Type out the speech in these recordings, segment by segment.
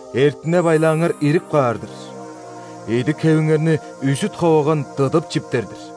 Эртине-байлааңар ирип каар-дыр, идик-хевиңерни үзүт-ховаган дыдып чиптер-дир.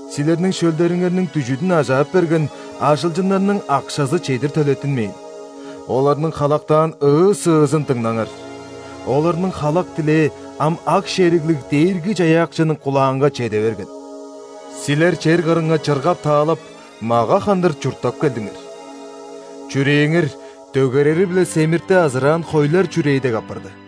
Силерниң шөлдериңерниң дүжүдүн ажаап берген ажылчыннарның акшазы чедир төлеттинмээн. Оларның халактаан ыы-сыызын дыңнаңар. Оларның халак-тилээ ам Аг-шериглиг Дээрги-Чаяакчының кулаанга чеде берген. Силер чер кырынга чыргап-таалап, мага хандыр чурттап келдиңер. Чүрээңер дөгерери-биле семирти азыраан хойлар чүрээ дег апарды.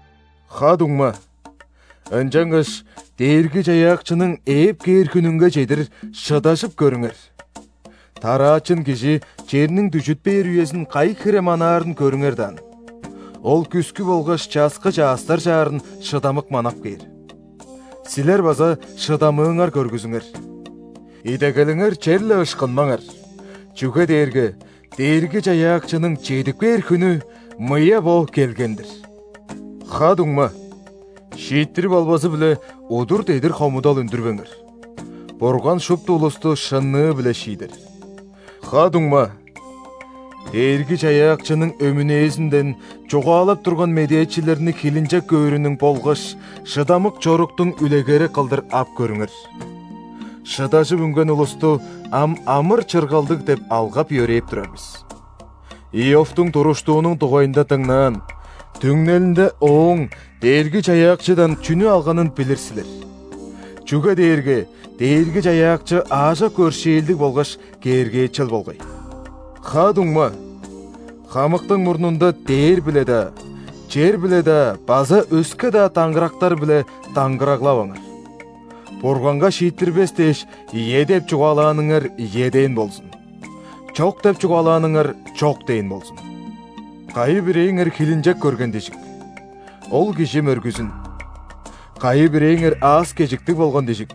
Ха-дуңма, ынчангаш Дээрги-Чаяакчының ээп кээр хүнүнге чедир шыдажып көрүңер. Тараачын кижи черниң дүжүт бээр үезин кайы хире манаарын көрүңер даан. Ол күскү болгаш часкы чаъстар чаарын шыдамык манап кээр. Силер база шыдамыыңар көргүзүңер. Идегелиңер черле ышкынмаңар, чүге дээрге Дээрги-Чаяакчының чедип кээр хүнү мыя бо келген-дир. Ха-дуңма, шииттирип албазы-биле, удур-дедир хомудал үндүрбеңер. Бурган шупту улусту шынныы-биле шиидер. Ха-дуңма, Дээрги-Чаяакчының өмүнээзинден чугаалап турган медээчилерни хилинчек көөрүнүң болгаш шыдамык чоруктуң үлегери кылдыр ап көрүңер. Шыдажып үнген улусту ам амыр-чыргалдыг деп алгап-йөрээп турар бис. Иовтуң туруштуунуң дугайында дыңнаан, түңнелинде ооң Дээрги-Чаяакчыдан чүнү алганын билир силер. Чүге дээрге Дээрги-Чаяакчы аажок өршээлдиг болгаш кээргээчел болгай. Ха-дуңма, хамыктың мурнунда дээр-биле-даа, чер-биле-даа база өске-даа даңгырактар-биле даңгыраглаваңар. Бурганга шииттирбес дээш, «ийе» деп чугаалааныңар «ийе» дээн болзун, «чок» деп чугаалааныңар «чок» дээн болзун. Кайы-бирээңер хилинчек көрген дижик? Ол кижи мөргүзүн. Кайы-бирээңер аас-кежиктиг болган дижик?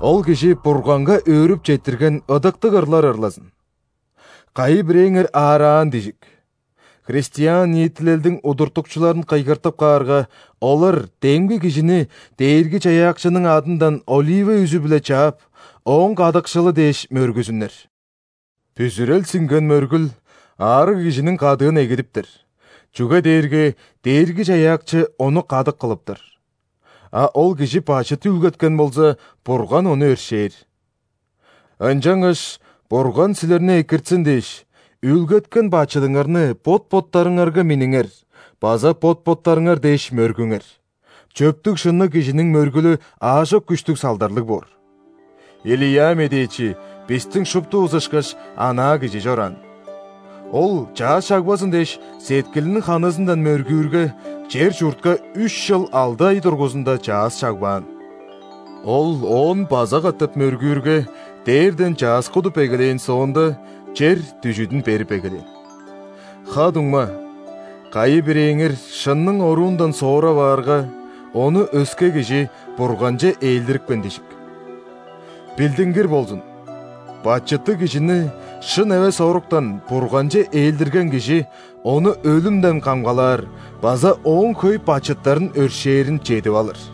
Ол кижи Бурганга өөрүп четтирген ыдыктыг ырлар ырлазын. Кайы-бирээңер аараан дижик? Христиан ниитилелдиң удуртукчуларын кыйгыртып каарга, олар демги кижини Дээрги-Чаяакчының адындан олива үзү-биле чаап, ооң кадыкшылы дээш мөргүзүннер. Бүзүрел сиңген мөргүл аарыг кижиниң кадыын эгидиптер, чүге дээрге Дээрги-Чаяакчы ону кадык кылыптар. А ол кижи бачыт үүлгеткен болза, Бурган ону өршээр. Ынчангаш Бурган силерни экиртсин дээш, үүлгеткен бачыдыңарны бот-боттарыңарга минниңер база бот-боттарыңар дээш мөргүңер. Чөптүг-шынныг кижиниң мөргүлү аажок күштүг салдарлыг боор. Илия медээчи, бистиң шуптувус ышкаш, анаа кижи чораан. Ол, чаъс чагбазын дээш, сеткилиниң ханызындан мөргүүрге, чер-чуртка үш чыл алды ай дургузунда чаъс чагбаан. Ол оон база катап мөргүүрге, дээрден чаъс кудуп эгелээн соонда, чер дүжүдүн берип эгелээн. Ха-дуңма, кайы-бирээңер шынның оруундан соора баарга, ону өске кижи Бурганче ээлдирипкен дижик. Билдингир болзун: бачыттыг кижини шын эвес оруктан Бурганче ээлдирген кижи ону өлүмден камгалаар база ооң хөй бачыттарын өршээрин чедип алыр.